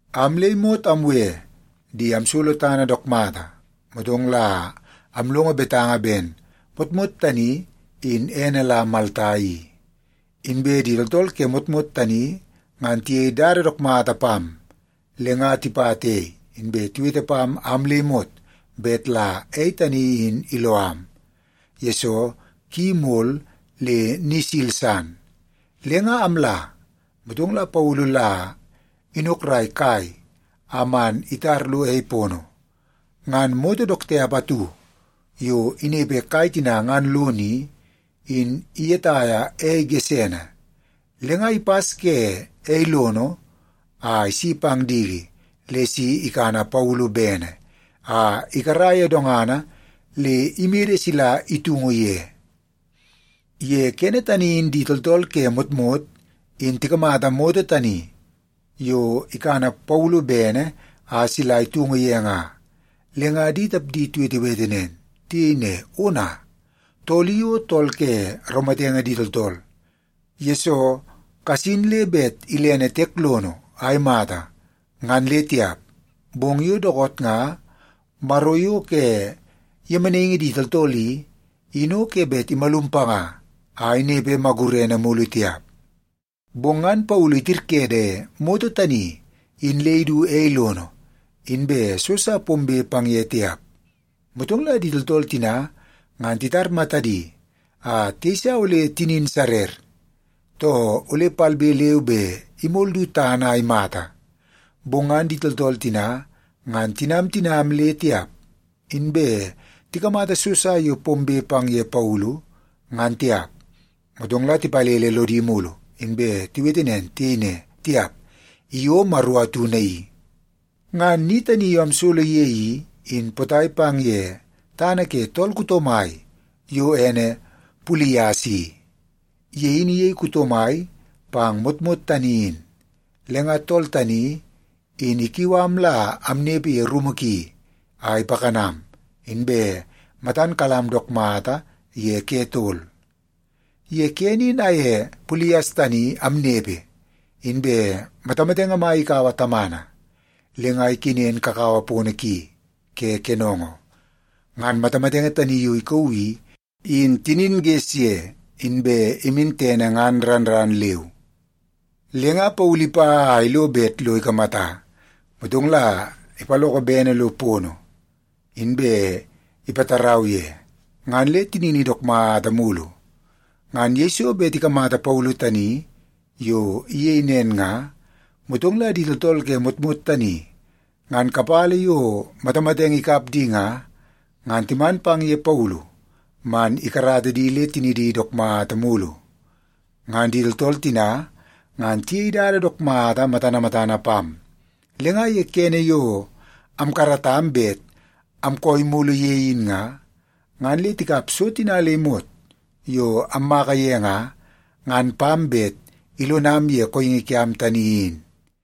Am le imot amwe di amsolo tana dook mata. Motong la amlongo betanga ben motmot tani in ene la Malta i. Inbe di tooltool ke motmot tani ngan tiyei dada dook mata pam. Le nga tipata ei, inbe tiwete pam am le imot bet la ei tani in iloo am, yesoo ki mol le ni isil san. Le nga amla, motong la Paulu la inokrai kai a man itar lo ei pono. Ngan moto dook tiap atu yo inepe kai tina ngan lono i, in iyetaia ei gesene, le nga ipas ke ei lono a isi pang diki le si ikana Paulu bene a ikara ye dongana le imede sila itungu ye. Ye kene tani in di tooltool ke motmot in tikamata moto tani yo ikana Paulu bene a sila itungu ye nga, le nga di tapdi tiwetewete nen. Tiyei ne, “Ona, tool i o tool ke raumatenge di tooltool, yesoo kasin le bet ilene tiek lono a imata, ngan le tiap. Bong yo dookoot nga maro yo ke yemenaingi di tooltool i, in o ke bet imalum panga a inepe magurene mulu tiap.” Bong ngan Paulu itirkede moto tani in le idu ei lono, inbe so sa pombe pang ye tiap. Motong la di tooltool tina ngan titar matadi a tiyeisa ole tinin sarer, too ole palbe leu be imol du tana a imata. Bong ngan di tooltool tina ngan tinam tinam le tiap, inbe tikamata so sa yo pombe pang ye Paulu, ngan tiap. Motong la tipalele lodi mulu, inbe tiwete nen. Tiyei ne, “Tiap, i o maro atu naii.” Ngan ni tani yo amsolo ye i, in potai pang ye tana ke tool kuto mai yo ene Pulias i. Ye in iyei kuto mai pang motmot tani in. Le nga tool tani in ikiu am la amnepe ye rumu ki a ipakanam, inbe matan kalam dook mata ye ke tol. Ye kene in amye Pulias tani amnepe, inbe matamatenge mai ikaua tamana le nga ikenen kakawa pono ki ke kenongo. Ngan matamatenge tani yo ikauu i, in tinin ges ye, inbe imin tene ngan ran ran leu. Le nga Paulu ipa a ilo bet lo ikamata, motong la ipaloko bene lo pono, inbe ipatarau ye, ngan le tinini dook mata mulu. Ngan yeiso bet tikamata Paulu tani yo iyei nen nga, motong la di tooltool ke motmot tani ngan kapala yo matamatenge ikap di nga, ngan timan pang ye Paulu man ikarata di le tinidi dook mata mulu. Ngan di tooltool tina ngan tiyei dada dook mata matana matana pam, le nga ye kene yo amkaratam bet amkooi mulu ye in nga, ngan le tikap so tina le imot yo ammaka ye nga, ngan pam bet ilonam ye kooingi kiam tani in.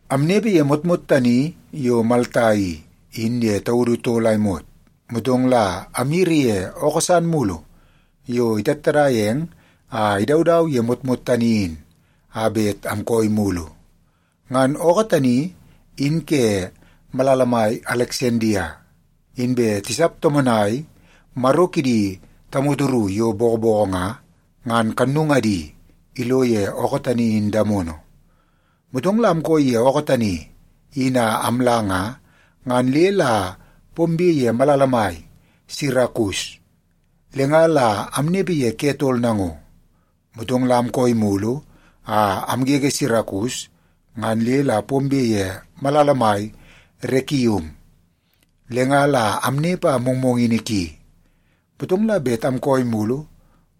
Amnepe ye motmot tani yo Malta i, in ye taudu tol a imot, motong la amyiri ye ookoo san mulu yo itattadaia eng a idaudau ye motmot tani in a bet amkooi mulu. Ngan ookoo tani in ke malala mai Aleksandia, inbe tisap tomonai maro kidi tamoto ru yo bokoboko nga, ngan kannungadi ilo ye ookoo tani in damono. Motong la amkooi ye ookoo tani in a amla nga, ngan le la pombe ye malala mai Sirakus, le nga la amnepe ye ke tol nango. Motong la amkooi mulu a amgege Sirakus, ngan le la pombe ye malala mai Rekium. Le nga la amnepe a mongmongini ki, motong la bet amkooi mulu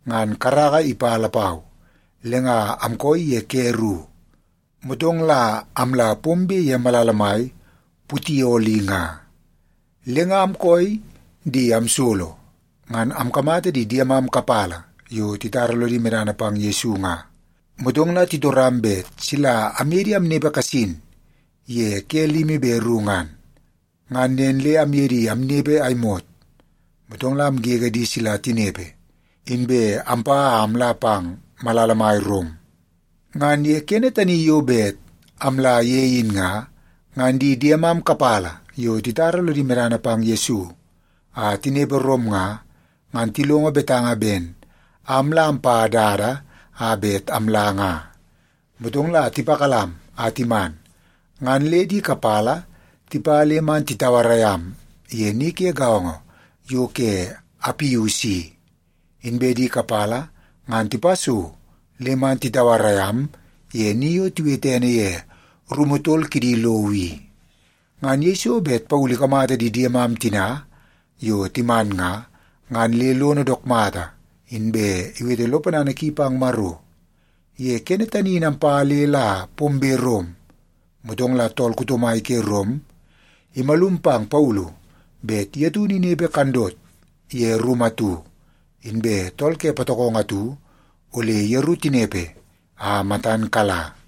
ngan karaka ipa lapau, le nga amkooi ye ke ru, motong la amla pombe ye malala mai Putioli nga. Le nga amkooi di amsolo, ngan amkamata di diemam kapala yo titara lodi medana pang Yesu nga. Motong la titoram bet sila amye di amnepe kasin ye ke limi be ru ngan. Ngan nen le amye di amnepe a imot, motong la amgege di sila tinepe, inbe ampa a amla pang malala mai Rom. Ngan ye kene tani yo bet amla ye in nga, ngan di diemam kapala yo titara lodi medana pang Yesu a tinepe Rom nga, ngan tilongo betanga ben am la ampa dada a bet amla nga. Motong la tipakalam a timan, ngan le di kapala tipa le man titauarai am ye ni ke gaongo yo ke Apius i, inbe di kapala ngan tipa so le man titauarai am ye ni yo tiwete ene ye Rumu Tol Kidi Lowo i. Ngan yeiso bet Paulu ikamata di diemam tina yo timan nga, ngan le lono dook mata, inbe iwete lo ponana ki pang Maro. Ye kene tani in ampa le la pombe Rom, motong la tool kuto mai ke Rom imalum pang Paulu bet ye taunu inepe kandot ye rumu atu, inbe tool ke patokongo atu ole yeru tinepe a matan kala.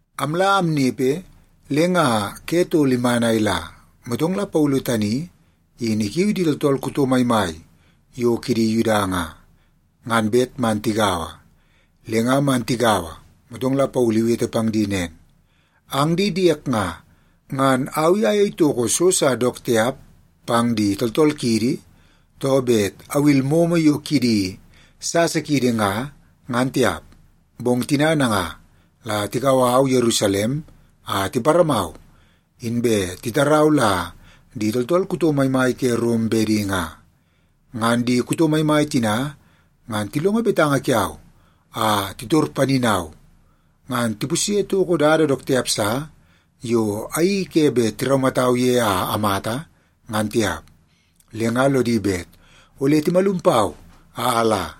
Amla amnepe, le nga ke tol iman a ila, motong Paulu tani in ikiu di tooltool kuto maimai yo kidi Yuda nga, ngan bet man tigaua. Le nga man tigaua, motong la Paulu iwete pang di nen, “Ang di diek nga, ngan au i ayei toko so sa dook tiap pang di tooltool kiidi, too bet awil momo yo kidi sasa kiidi nga, ngan tiap. Bong tina nanga la tikau au Yerusalem a tiparamau, inbe titarau la di tooltool kuto maimai ke Rom bedi nga. Ngan di kuto maimai tina ngan tilongo betanga kiau a titor paninau, ngan tipusye toko dada dook tiap sa yo ayeii ke bet tiraumatau ye a amata, ngan tiap. Le nga lodi bet ole timalum pau a ala.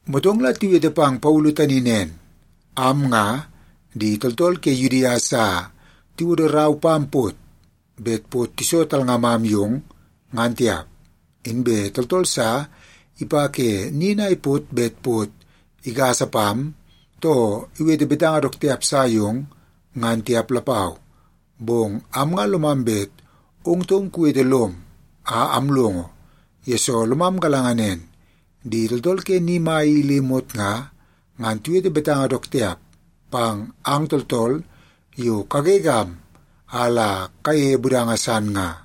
Motong la tiwete pang Paulu tani nen, “Am nga, di tooltool ke Yudia sa tiwodo rau pam pot bet pot iso talngamam yong, ngan tiap. Inbe tooltool sa ipa ke nin a ipot bet pot igasa pam, too iwete betanga dook tiap sa yong, ngan tiap lapau. Bong am nga lomam bet ong taum kuwete lom a amlongo, yesoo lomam galanga nen di tooltool ke ni mai i le imot nga, ngan tiwete betanga dook tiap pang ang tooltool yo kagegam a la kayeie budanga san nga.”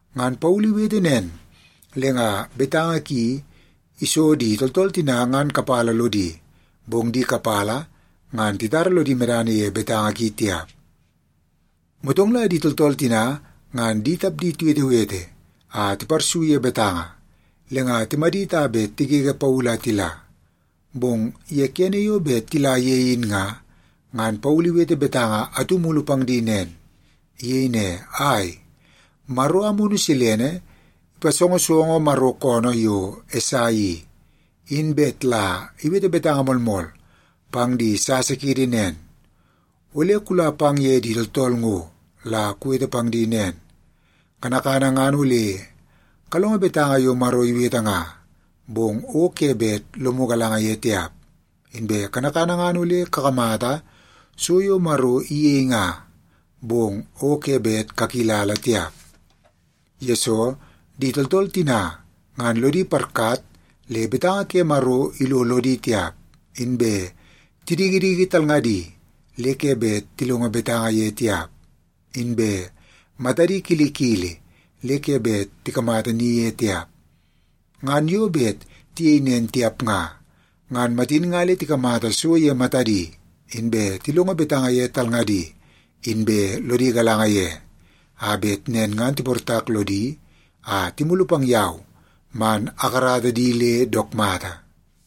Ngan Paulu iwete nen, le nga betanga ki iso di tooltool tina ngan kapala lodi, bong di kapala ngan titara lodi medana ye betanga ki tiap. Motong la di tooltool tina ngan di tapdi tiwetewete a tiparsu ye betanga, le nga timadit a bet tigege Paulu a tila. Bong ye kene yo bet tila ye in nga, ngan Paulu iwete betanga atu mulu pang di nen. Iyei ne, “Ai, Maro Amunu Silene ipasongosongo Maro koonoo yo Esai i, in bet la iwete betanga moolmool pang di sasa kiidi nen, ‘Ole kula pang ye di tooltool ngo la kuwete pang di nen, “Kanakana ngan ole kalongo betanga yo Maro iwete nga, bong o ke bet lomu galanga ye tiap. Inbe kanakana ngan ole kakamata so yo Maro iyei nga, bong o ke bet kakilala tiap.” Yesoo, di tooltool tina ngan lodi parkat le betanga ke Maro ilo lodi tiap, inbe tidikidiki talngadi le ke bet tilongo betanga ye tiap, inbe matadi kilikili le ke bet tikamata ni ye tiap. Ngan yo bet tiyei nen tiap nga, ngan matin nga le tikamata so ye matadi, inbe tilongo betanga ye talngadi, inbe lodi galanga ye, a bet nen ngan tiportak lodi a timulu pang yau man akarata di le dook mata.’”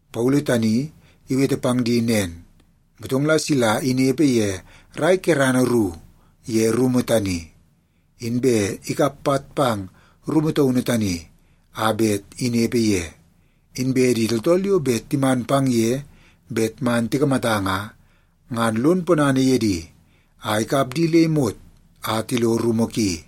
Paulu tani iwete pang di nen, motong la sila inepe ye rai kerana ru ye rumu tani. Inbe ikap pat pang rumu taunu tani a bet inepe ye. Inbe di tooltool yo bet timan pang ye bet man tikamata nga, ngan lon ponana ye di a ikap di le imot a tilo rumu ki.